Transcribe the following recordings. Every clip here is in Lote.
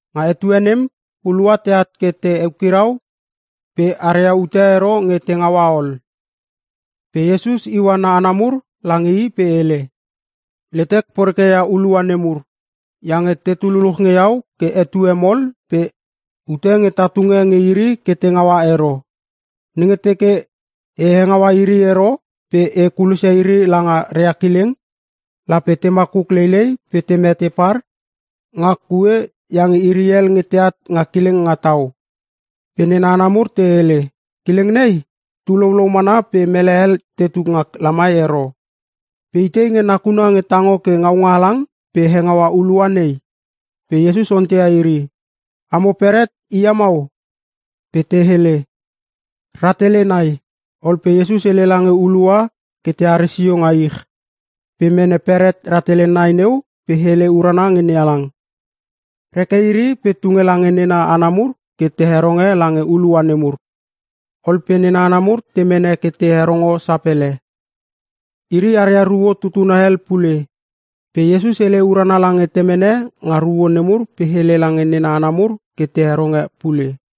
Nga etue nem hulua teat ke te eukirau pe aria ute ero nge te ngaua ol. Pe Iesus iua na hana mur lange i pe hele, “Letek poreke ia hulua nemur iange tetu luluch nge iau ke etue mol pe ute nge ta tunge nge iri ke te ngaua ero. Nenge teke e hengaua iri ero pe e kulosia iri langa ria kileng, lape te makuk leilei pe te mete par nga kue iange iri hel nge teat nga kileng nga tau.” Pe nena hana mur te hele, “Kileng nei tu loulou mana pe mele hel tetu nga lamai ero, pe itei nakuna nge tango ke ngaunga halang pe hengaua hulua nei?” Pe Iesus onteia iri, “Amo beret hia mau?” Pe te hele, “Rahtele nai.” Ol pe Iesus hele lange hulua ke teare sio nga ich. Pe mene beret rahtele nai neu pe hele urana nge NeHalang. Reke iri pe tunge lange nena hana mur ke te heronge lange hulua nemur. Ol pe nena hana mur te mene ke te herongo sapele. Iri aria ruo tutuna hel pule. Pe Iesus hele urana lange temene nga ruo nemur pe hele lange nena hana mur ke te heronge pule.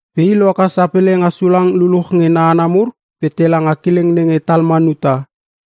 Pe i lohaka sapele nga sulang luluch nge na hana mur pe tela nga kileng nenge Talmanuta.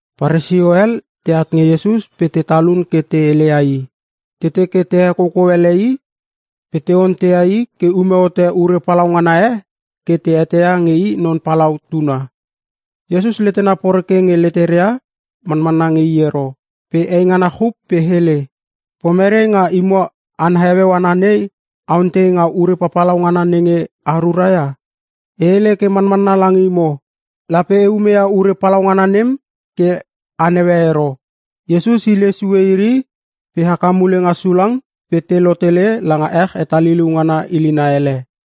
Paresio hel teat nge Iesus pe te talun ke te heleia i. Te teke te hekoukou ele i pe te onteia i ke ume hote ure palaungana e ke te eteia nge i Non Palau tuna. Iesus letena poreke nge leteria manmanna nge i ero pe eingana chup pe hele, “Pomere nga imo hana heueu ana nei a ontei nga ure papalau ngana nenge a rura ia? E hele ke manmanna lange imo, lape e umeia ure palaungana nem ke a neue ero.” Iesus hile sue iri pe haka mule nga sulang pe te lotele langa ech hetaliliu ngana ilina ele.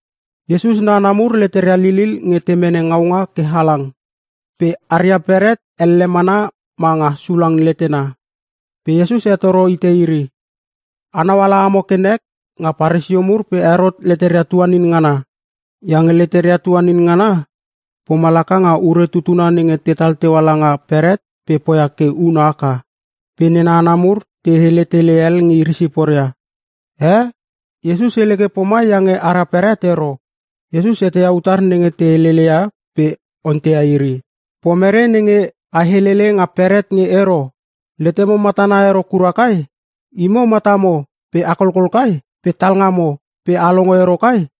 Iesus na hana mur leteria lilil nge te mene ngaunga ke halang. Pe aria beret elle mana ma nga sulang letena. Pe Iesus hetoro hite iri, “Anau ala amo ke nek nga Paresio mur pe Herot leteria tuanin ngana, iange leteria tuanin ngana poma laka nga ure tutuna nenge tetal teua langa beret pe poia ke una haka(is).” Pe nena hana mur te hele tele hel nge iri siporia, “Ee! Iesus hele ke pomai iange ara beret ero.” Iesus eteia utar nenge te heleleia pe onteia iri, “Pomere nenge a heleleia nga beret nge ero? Letemo matana ero kura kai? Imo matamo pe a kolkol kai? Pe talngamo pe a longo ero kai?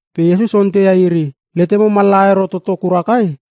Pe Iesus onteia iri, “Letemo mallaha ero toto kura kai?”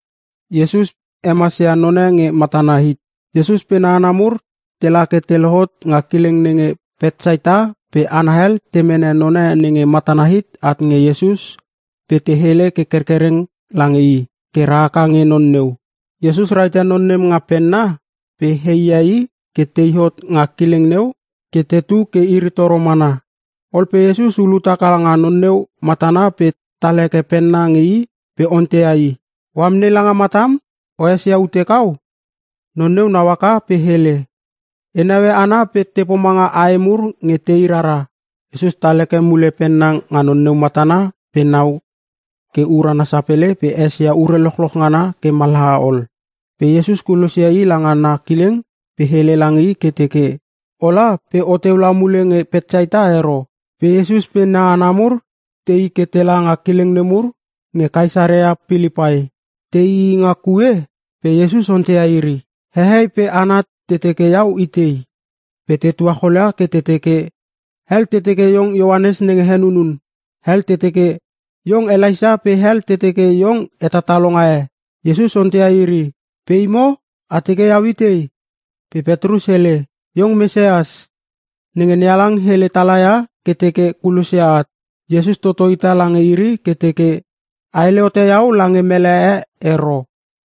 Iesus pe na hana mur tela ke te lohot nga kileng nenge Petsaita pe hana hel te mene none nenge matana hit at nge Iesus pe te hele ke kerkereng lange i ke rahaka nge non neu. Iesus rahite non nem nga penna pe he i ia i ke tei hot nga kileng neu ke tetu ke iri toro mana. Ol pe Iesus ulut haka nga non neu matana pe tal heke penna nge i pe onteia i, “O amnei langa matam? O esia ute kau?” Non neu nau haka pe hele, “E neue hana pe te pomanga ae mur nge tei rara.” Iesus tal heke mule penna nga non neu matana pe nau ke urana sapele pe esia ure lochloch ngana ke mallaha ol. Pe Iesus kulosia i langa na kileng pe hele lange i ke teke, “Ola pe oteu la mule nge Petsaita ero.” Pe Iesus pe na hana mur tei ke tela nga kileng nemur nge Kaesarea Pilipai. Teii nga kue pe Iesus onteia iri, “Hehei pe hana te teke iau itei?” Pe te tuacholia ke te teke, “Hel te teke iong Ioanes nenge Henunun. Hel te teke iong Elaisa pe hel te teke iong hetatalonga e.” Iesus onteia iri, “Pe imo? A teke iau itei?” Pe Petrus hele, “Iong Mesias, nenge NeHalang hele tala ia ke teke kulosia at.” Iesus toto hita lange iri ke teke, “A hele hote iau lange mele e ero.”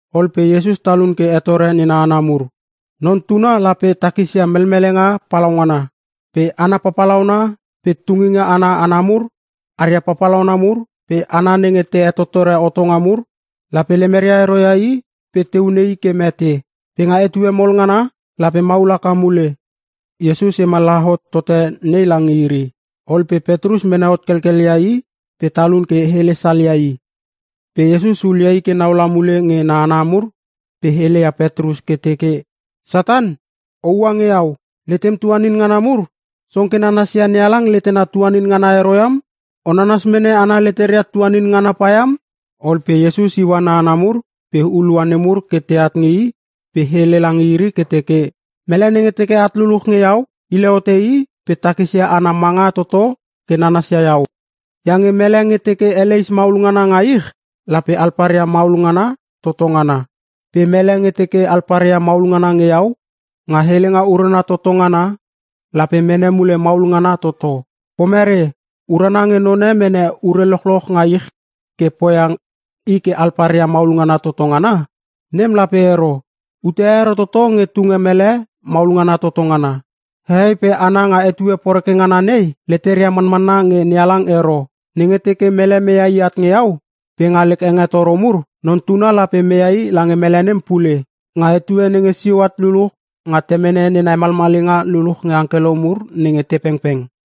Ol pe Iesus talun ke hetore nena hana mur, “Non Tuna lape takisia melmelenga palaungana. Pe hana papalauna pe tunginga ana hana mur aria papalauna mur pe hana nenge te hetottore hotonga mur, lape lemeria ero ia i pe te hune i ke mete. Pe nga etue mol ngana, lape maul haka mule.” Iesus hemallaha hot tote nei lange iri. Ol pe Petrus mene hot kelkel ia i pe talun ke hele salia i. Pe Iesus hulia i ke nau la mule nge na hana mur pe heleia Petrus ke teke, “Satan, oua nge iau. Letem tuanin ngana mur song ke nanasia NeHalang letena tuanin ngana ero iam. O nanas mene hana leteria tuanin ngana pa iam.” Ol pe Iesus iua na hana mur pe hulua nemur ke teat nge i pe hele lange iri ke teke, “Mele nenge teke at luluch nge iau, hile hote i pe takisia ana manga toto ke nanasia iau. Iange mele nge teke eleis maulngana nga ich, lape alparia maulngana toto ngana. Pe mele nge teke alparia maulngana nge iau, nga helenga urana toto ngana lape mene mule maulngana toto. Pomere, urana nge none mene ure lochloch nga ich ke poia i ke alparia maulngana toto ngana? Nem lape ero! Ute e ero toto nge tunge mele maulngana toto ngana. Hehei pe hana nga etue poreke ngana nei, leteria manmanna nge NeHalang ero. Nenge teke mele meia i at nge iau pe nga lek hengetoro mur, Non Tuna lape meia i lange mele nem pule nga etue nenge sio at luluch nga Temene nena hemalmalinga luluch nge angkelo mur nenge te pengpeng.”